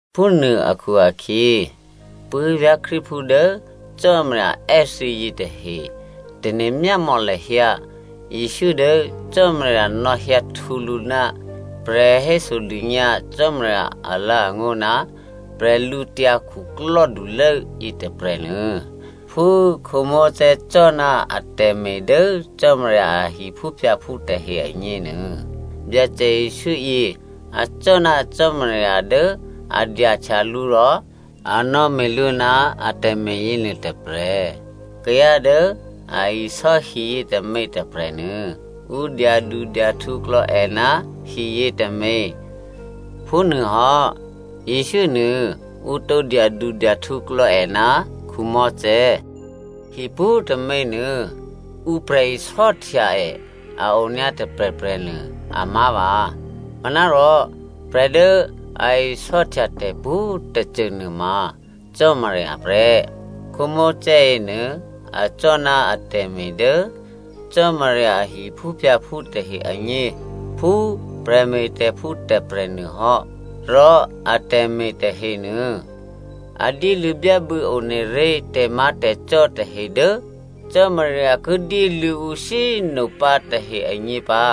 Phúnuô akhu-akhyě, puố̤vyá̤ Krístuphú dố Cò́marya è́ thǐ yětahe꤮ tane̤ myámò̌ lahyǎ Jesǔ dố Cò́marya nò̌hyǎ htwǒ lǔ ná prè̤hésodônyǎ Cò́marya alǎ̤angó̤ ná bwídukhulố yětôprè̤nuô. Phú Mosè cò́ ná atè̤me̤ dố Cò́marya a hiphúphyǎphú tahe agněnuô, Byacè Jesǔ yě, acò́ ná Cò́marya dố a dyahtya lǔ rò a nò̌me̤ lǔ ná atè̤me̤ yěnuô tôprè̤. Kayǎ dố a isò́ hi yětômě tôprè̤nuô, ǔ dyadudyahtǔklò̌ è ná hiyě tômě. Phúnuôhò́ Jesǔ nuô ǔ tǒ dyadudyahtǔklò̌ è ná Mosè. Hi pwǒ̤tômě nuô ǔ prè̤isò́htya è a onyǎ tôprè̤prè̤ nuô amá̤vǎ. Manárò prè̤ dố a isò́htya tè̤pwǒ̤꤮ tôcô nuôma Cò́marya prè́. Mosè yěnuô acò́ ná atè̤me̤ dố Cò́marya a hiphúphyǎphú tahe agně phú prè̤me̤tè̤phú tôprè̤ nuôhò́. Rò atè̤me̤ tahenuô, a dyéluô̌ byábû̌ one ré̤ tè̤má̤tè̤cò́ tahe dố Cò́marya ki dyéluô̌ ǔ shyé꤮ nopǎ tahe agně pǎ.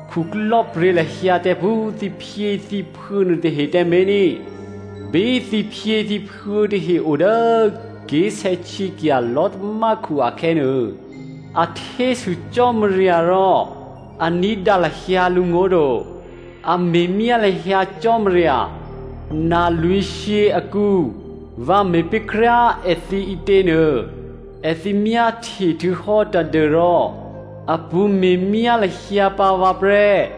khuklò́pryě̤ lahyǎ tǎ phú thǐphyěthǐphuô̌ nuôtahe tǎmé̤ ní꤮. Bí thǐphyěthǐphuô̌ tahe o dố ké̤sè̌htyěkya̤ lò̤́tamákhu akhè̌nuô, a htésû Cò́marya rò a ní̤dǎ lahyǎ lǔngó̤ to. A me̤myá lahyǎ Cò́marya. Na lwǐ̤shyě akǔ, vǎ me̤pé̤ kryá꤮ èthǐ ǐtě nuô, èthǐ myáhtye htuô̌hò́ tadû́rò a pṳ̌ me̤myá lahyǎ pǎ vǎ prè́.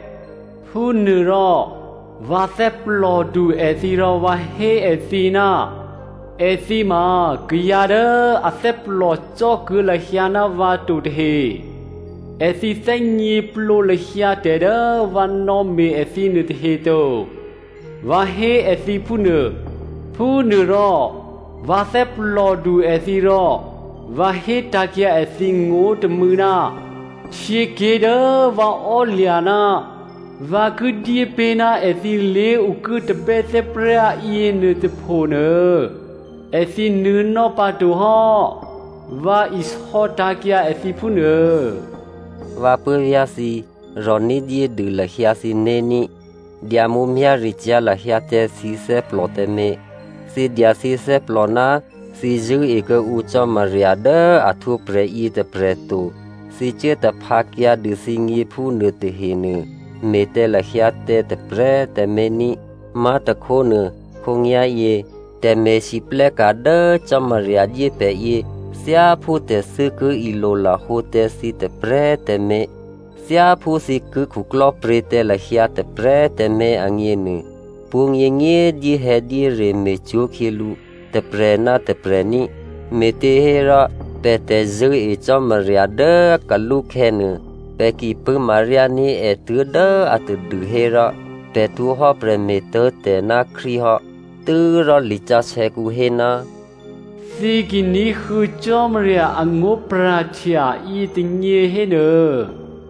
Phúnuôrò vǎ thè́plòdu èthǐ rò vǎ hé èthǐ, ‘Èthǐ ma kayǎ dố athè́plò cò́ kuô̌ lahyǎ ná vǎ to tahe. Èthǐ thè́gněplǒ lahyǎ tè̤ dố vǎ nò̌me̤ èthǐ nuôtahe to,’ vǎ hé èthǐ phúnuô. Phúnuôrò vǎ thè́plòdu èthǐ rò vǎ hétǎ̤kyǎ èthǐ ngó̤ tômû̌, ‘Htyěké̤ dố vǎ ò́lya̤ ná vǎ ki dyépé̤ ná èthǐ lé̤okuố tabè́thè́prá yěnuôtôpho nuô, èthǐ nuô̌nò́ pǎto hò́,’ vǎ isò̌ tǎ̤kyǎ èthǐ phúnuô.” Vǎ puố̤vyá̤ thǐ꤮, rò̤ ní̤dyédû lahyǎ thǐné̤ ní꤮. Dya mǔmyá̤ricyá̤ lahyǎ tǎ thǐ thè́plò tǎmé̤, thǐ dya thǐ thè́plò ná thǐ zṳ̂́e kuô̌ǔ Cò́marya dố a htwǒprè̤ yětôprè̤ to, thǐ cuố taphǎkyǎ dû thǐgně phúnuô tahenuô me̤ tǎ lahyǎ tǎ tôprè̤꤮ tǎmé̤ ní꤮. Má̤tôkhónuô, khǒnyá̤yě tè̤me̤lwóhteka̤ dố Cò́marya dyé pè̤ yě thyáphú tè̤thû́ ki ilolahǒ tǎ thǐ tôprè̤꤮ tǎmé̤, thyáphú thǐ ki khuklò́pryě̤ tǎ lahyǎ tôprè̤꤮ tǎmé̤ agněnuô, pwǒ̤nyěnyě꤮ dyéhè̌dyére me̤cwó̤khyělǔ tôprè̤ ná tôprè̤ ní꤮. Me̤těhérò, pè̤ tè̤zṳ̂́e Cò́marya dố kalúkhè̌ nuô, pè̤ ki pṳ̂́maryání̤ è tuố̤dố atadû hérò, pè̤ htwǒhò́ prè̤me̤tố̤tè̤ ná Krístu hò́. Tû́rò lisǎsè̌kǔ hé, “Thǐ ki ní̤huô̌ Cò́marya angó̤pra̤htya yětônyě hénuô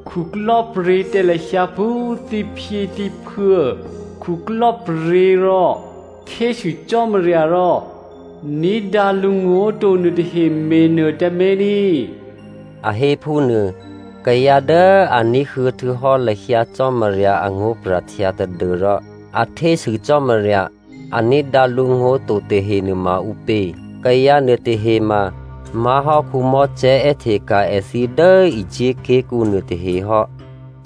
khuklò́pryě̤ tǎ lahyǎ phú thǐphyěthǐphuô̌ khuklò́pryě̤ rò htésû Cò́marya rò ní̤dǎ lǔngó̤ to nuôtahe me̤nuô tǎmé̤ ní꤮,” a hé phúnuô. Kayǎ dố a ní̤huô̌ htuô̌hò́ lahyǎ Cò́marya angó̤pra̤htya tadû́rò a htésû Cò́marya, a ní̤dǎ lǔngó̤ to tahe nuôma ǔpě? Kayǎ nuôtahe ma má̤hò́ Mosè è́hteka̤ èthǐ dố Egypt ké̤kǔ nuô tahehò́.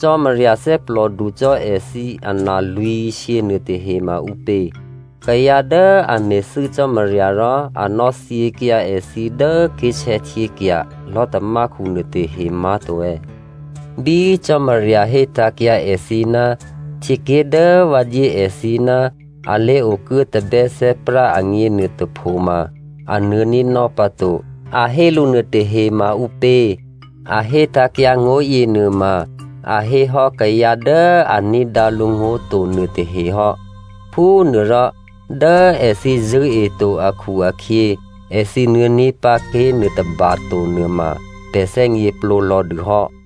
Cò́marya thè́plòdu cò́ èthǐ analwǐ̤shyě nuôtahe ma ǔpě? Kayǎ dố a me̤thû́ Cò́marya rò a nò̌thyěkyǎ èthǐ dố ké̤sè̌htyěkya̤ lò̤́tamákhu nuôtahe má̤to è̌? Bí Cò́marya hétǎ̤kyǎ èthǐ, htyěké̤ dố vǎ dyé èthǐ ná a lé̤okuố tabè́thè́prá agně nuôtôpho ma a nuô̌ ní̤nò́ pǎto a hé lǔ nuôtahe ma ǔpě? A hétǎ̤kyǎ ngó̤yě nuôma, a héhò́ kayǎ dố a ní̤dǎ lǔngó̤ to nuôtahe hò́. Phúnuôrò dố èthǐ zṳ̂́eto akhu-akhyě, èthǐ nuô̌ní̤ pǎ ké̤ nuôtôba to nuôma pè̤ thè́gněplǒ lò̌ dûhò́.